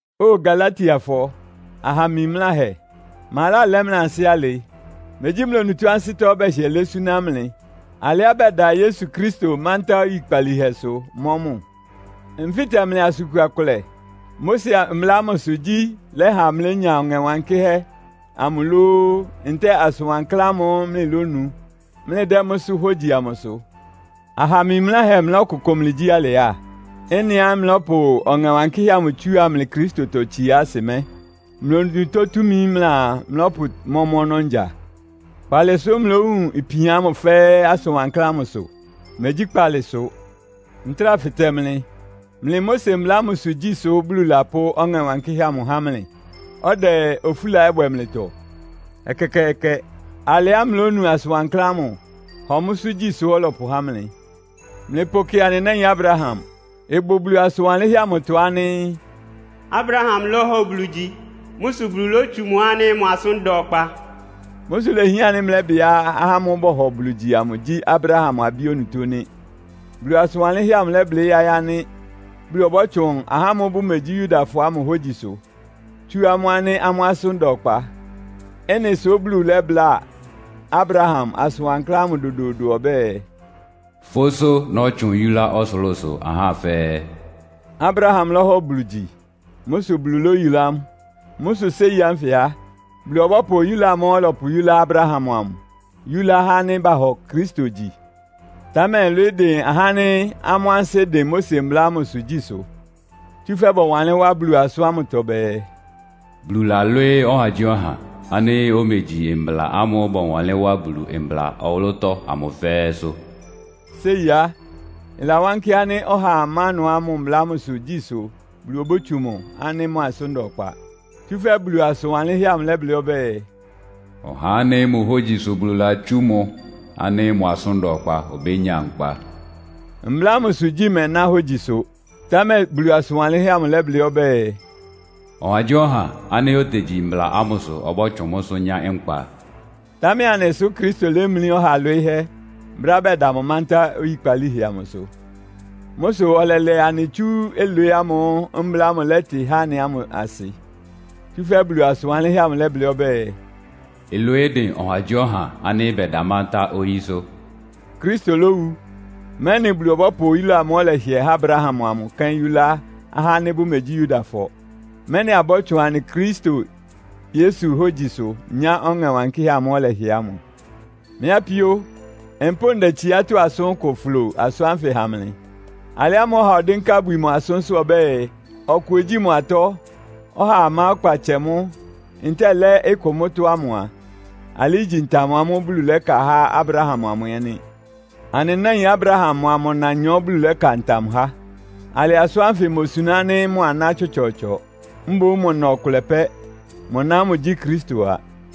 Óo Galatiafɔ aha mimláhɛ! Ma lálɛ́ mlɩ ansɩ́ alɩ? Megyí mlɩ onutó ansɩ́tɔ́ bɛhɩɛ lɛ́ súná mlɩ alɩá bɛda Yesu Kristo mántá oyikpalíhɛsʋ, mɔ́ mʋ? Nfɩ́tɛ mlɩ asʋn kua kʋlɛ. Mose Mbla ámʋsʋ gyí lɛ́ha mlɩlénya Ɔŋɛ Wankɩ́hɛ́ amʋ lóó, ntɛ́ɛ asʋn wankláán ámʋ́ʋ́ mlɩlónu, mlɩdɛ́ mʋ́sʋ́ hógyi amʋ sʋ? Aha mimláhɛ mlɩlɔ́kʋkʋ mlɩgyí alɩ á? Ɩ́nɩá mlɩlɔ́pʋ Ɔŋɛ Wankɩ́hɛ́ amʋ tsúa mlɩ Kristotɔtsiá asɩ mɛ́, mlɩ onutó túmi mlɩaa mlɔ́pʋmɔ́ mʋ́ ɔnɔ́ ngya? Kpaalɩ sʋ́ mlɩlówun ipian ámʋ fɛ́ɛ́ asʋn wankláán ámʋ sʋ? Megyí kpaalɩ sʋ! Ntráa fɩtɛ mlɩ. Mlɩ Mose mbla ámʋsʋ gyí sʋ́ Bulu lapʋ́ Ɔŋɛ Wankɩ́hɛ́ ámʋ há mlɩ, ɔdɛ ofúla ɛ́ bwɛ mlɩtɔ? Ɛkɛkɛɛkɛ! Alɩá mlɩlónu asʋn wankláán ámʋ, hɔ mʋ́sʋ́ gyí sʋ́ ɔlɔpʋhá mlɩ. Mlɩpʋkɩ anɩ náin Abraham. Ɩbʋ Bulu asʋn wanlɩ́nhɛ́ amʋtɔ ánɩ́, “Abraham lɔ́hɔ Bulu gyi. Mʋ́ sʋ Bulu lótsu mʋ ánɩ́ mʋ asʋ́n da ɔkpa.” Mʋ́ sʋ ilehián ánɩ́ mlɛ́bɩá ahá ámʋ́ʋ́ bɔhɔ Bulu gyi amʋ gyí Abraham abí onutó nɩ́. Bulu asʋn wanlɩ́nhɛ́ amʋ lɛ́blɩ́ yáɩ́ ánɩ́ Bulu ɔbɔ́tsʋn ahá ámʋ́ʋ́ bʋmegyí Yudafɔ ámʋ hógyisʋ, tsú amʋ́ ánɩ́ amʋ́ asʋ́n da ɔkpa. Ɩ́nɩ sʋ́ Bulu lɛ́bláa Abraham asʋn wankláán ámʋ dodoodo ɔbɛ́ɛ, “Fʋ́sʋ́ nɔ́tsʋn yulá ɔsʋlʋ́sʋ ahá fɛ́ɛ́.” Abraham lɔ́hɔ Bulu gyi. Mʋ́ sʋ Bulu lóyulá mʋ. Mʋ́ sʋ séi ánfɩ á, Bulu ɔbɔ́pʋ oyúla amʋ́ʋ́ ɔlɔpʋyúlá Abraham amʋ yúlá ahá ánɩ́ bahɔ Kristo gyi. Támɛ ɩlwɩɩ́ dɩn ahá ánɩ́ amʋ́ ansɩ́ dɩn Mose mbla ámʋsʋ gyísʋ. Tsúfɛ́ bɔwanlɩ́n wá Bulu asʋ́n ámʋtɔ bɛɛ, “Bulu lalwɩ́ɩ́ ɔhagyíɔha ánɩ́ omegyi mbla ámʋ́ʋ́ bɔwanlɩ́n wá Bulu mbla ɔwʋlʋ́tɔ́ ámʋ fɛ́ɛ́sʋ́.” Séi á, ɩlawánkɩ́ ánɩ́ ɔhaa má ɩnʋá mʋ mbla ámʋsʋ gyí sʋ Bulu obótsu mʋ ánɩ́ mʋ asʋ́n da ɔkpa. Tsúfɛ́ Bulu asʋn wanlɩ́nhɛ́ amʋ lɛ́blɩ́ ɔbɛ́ɛ, “Ɔhá ánɩ́ mʋ hógyi sʋ Bulu latsú mʋ ánɩ́ mʋ asʋ́n da ɔkpa obénya nkpa.” Mbla ámʋsʋ gyí mɛná hógyisʋ, támɛ Bulu asʋn wanlɩ́nhɛ́ amʋ lɛ́blɩ́ ɔbɛ́ɛ, “Ɔhagyíɔha ánɩ́ otegyi mbla ámʋsʋ ɔbɔ́tsʋn mʋ́sʋ́ nyá nkpa.” Támɛ anɩ sʋ́ Kristo lémlí ɔha lwɩɩ́hɛ́ brɛ́á bɛda mʋ mántá oyikpalíhɛ amʋsʋ. Mʋ́ sʋ ɔlɛlɛ anɩ tsú ɩlwɩɩ́ ámʋ́ʋ́ mbla ámʋ lɛ́tɩ há anɩ ámʋ asɩ. Tsúfɛ́ Bulu asʋn wanlɩ́nhɛ́ ámʋ lɛ́blɩ́ ɔbɛ́ɛ, “Ɩlwɩɩ́ dɩn ɔhagyíɔha ánɩ́ bɛda mántá oyísʋ́.” Kristo lówu, mɛ́nɩ Bulu ɔbɔ́pʋ oyúla amʋ́ʋ́ ɔlɛhɩɛ há Abraham amʋ kɛ́n yúlá ahá ánɩ́ bʋmegyí Yudafɔ, mɛ́nɩ abɔ́tsʋn anɩ Kristo Yesu hógyisʋ nyá Ɔŋɛ Wankɩ́hɛ́ amʋ́ʋ́ ɔlɛhɩɛ ámʋ. Mɩ́ apíó, mpʋ́ʋ ndɛ tsiátɔ́ asʋ́n kʋ flo asʋ́n ánfɩ ha mlɩ. Alɩ ámʋ́ʋ́ ɔha ɔdɩ́nká ibwi mʋ asʋ́nsʋ́ ɔbɛ́ɛ, ɔkʋ ogyíi mʋ atɔ́, ɔhaa má ɔkpa tsɛ mʋ́, ntɛ́ɛ lɛ́ ɩkʋ mʋ́tɔ́ ámʋ a, alɩ igyi ntam amʋ́ʋ́ Bulu lɛ́ka há Abraham amʋ ɛ́ nɩ́. Anɩ náin Abraham mʋa mʋ nanyɔ Bulu lɛ́ka ntam há. Alɩ asʋ́n ánfɩ imosuná ánɩ́ mʋ aná tsɔtsɔɔtsɔ, mboún mʋ na ɔkʋlɛ pɛ́. Mʋ na ámʋ gyí Kristo a.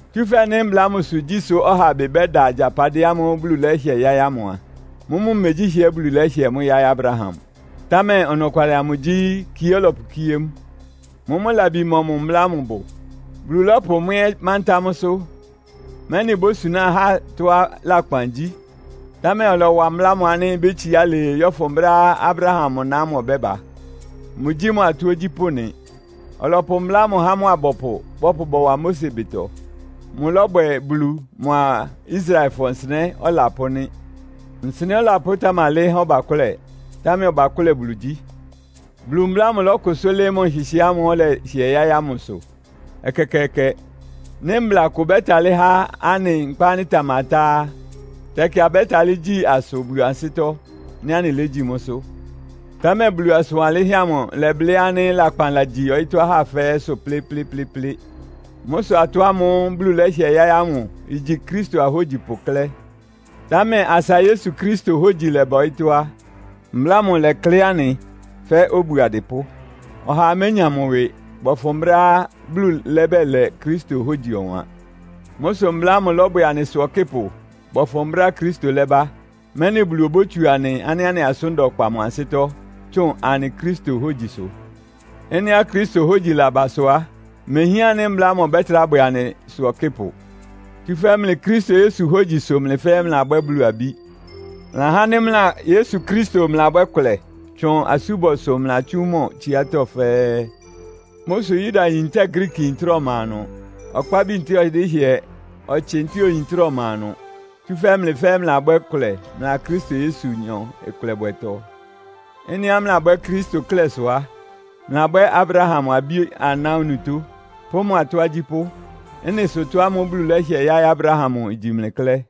Tsúfɛ́ nɩ́ mbla ámʋsʋ gyí sʋ ɔha ɩbɩ bɛ́da agyapadɩɛ ámʋ́ʋ́ Bulu lɛ́hɩɛ yáɩ́ ámʋ a, mʋ́mʋ́ megyí hɩɛ Bulu lɛ́hɩɛ mʋ́ yáɩ́ Abraham. Támɛ ɔnɔkwalɩ amʋ gyí, kie ɔlɔpʋkíé mʋ. Mʋ́mʋ́ labi mɔmʋ mbla ámʋ bʋ? Bulu lɔ́pʋ mʋ́ ɛ́ mántá mʋ́sʋ́, mɛ́nɩ ibósuná ahá tɔ́á lakpan gyí. Támɛ ɔlɔwa mbla ámʋ ánɩ́ ibétsiá alɩɩ yɔ́fʋn brɛ́á Abraham mʋ na ámʋ ɔbɛ́ba. Mʋgyí mʋ atɔ́ ogyípʋ́ nɩ. Ɔlɔpʋ mbla ámʋ há mʋ abɔpʋ bɔpʋ bɔwa Mose ɩbɩtɔ. Mʋlɔ́bwɛ Bulu mʋ́a Israelfɔ nsɩnɛ́ ɔlapʋ́ nɩ́. Nsɩnɛ́ ɔlapʋ́ tamalɩ́ɩ́ há ɔbakʋ́lɛ, támɛ ɔbakʋ́lɛ Bulu gyí. Bulu mbla ámʋ ɩlɔkʋsʋ́ lɩ́ɩ́ mʋ nhɩhɩɛ́ ámʋ́ʋ́ ɔlɛhɩɛ yáɩ́ ámʋsʋ? Ɛkɛkɛɛkɛ! Nɩ́ mbla kʋ ɩbɛ́talɩ́ há anɩ nkpa ánɩ́ ɩtamatá á, tɛkɩ abɛ́talɩ́ gyí asʋ Bulu ansɩ́tɔ́, nɩ́ anɩlégyí mʋ́sʋ́. Támɛ Bulu asʋn wanlɩ́nhɛ́ amʋ ɩlɛblɩ́ ánɩ́ lakpan lagyi ɔyɩ́tɔ́ ahá fɛ́ɛ́sʋ́ plɩ́plɩ́plɩ́plɩ́. Mʋ́ sʋ atɔ́ ámʋ́ʋ́ Bulu lɛ́hɩɛ yáɩ́ ámʋ igyi Kristo ahógyipʋ klɛ́. Támɛ asa Yesu Kristo hógyi lɛ́bá ɔyɩ́tɔ́ á, mbla ámʋ ɩlɛklɩ́ anɩ fɛ́ obu adɩpʋ́. Ɔhaa ménya mʋ ɩwɩ, bɔfʋn brɛ́á Bulu lɛ́bɛlɛ Kristo hógyi ɔwan. Mʋ́ sʋ mbla ámʋ lɔ́bwɛ anɩsʋ ɔkɩ́pʋ bɔfʋn brɛ́á Kristo lɛ́ba, mɛ́nɩ Bulu obótsu anɩ ánɩ́ anɩ asʋ́n da ɔkpa mʋ ansɩ́tɔ́, tsʋ́ʋn anɩ Kristo hógyisʋ. Ɩ́nɩá Kristo hógyi laba sʋ á, imehián ánɩ́ mbla ámʋ ɔbɛ́trá bwɛ anɩsʋ ɔkɩ́pʋ. Tsúfɛ́ mlɩ Kristo Yesu hógyi sʋ mlɩ fɛ́ɛ́ mlɩlabwɛ́ Bulu abí. Mlɩ ahá ánɩ́ mlɩa Yesu Kristo mlɩlabwɛ́ kʋlɛ tsʋn asúbɔsʋ mlɩlatsú mʋ tsiátɔ́ fɛ́ɛ́. Mʋ́ sʋ Yudayin ntɛ́ɛ Griikiyin trá ɔma ɩnʋ. Ɔkpábi ntɛ́ɛ ɔdɩ́hɩɛ, ɔtsɩ ntɛ́ɛ oyin trá ɔma ɩnʋ. Tsúfɛ́ mlɩ fɛ́ɛ́ mlɩlabwɛ́ kʋlɛ mlɩa Kristo Yesunyɔ ɩkʋlɛbwɛtɔ. Ɩ́nɩá mlɩlabwɛ́ Kristo klɛ́ sʋ á, mlɩlabwɛ́ Abraham abí-aná onutó, pʋ́ mʋ atɔ́ agyípʋ́. Ɩ́nɩ sʋ ɩtɔ́ ámʋ́ʋ́ Bulu lɛ́hɩɛ yáɩ́ Abraham amʋ igyi mlɩ klɛ́.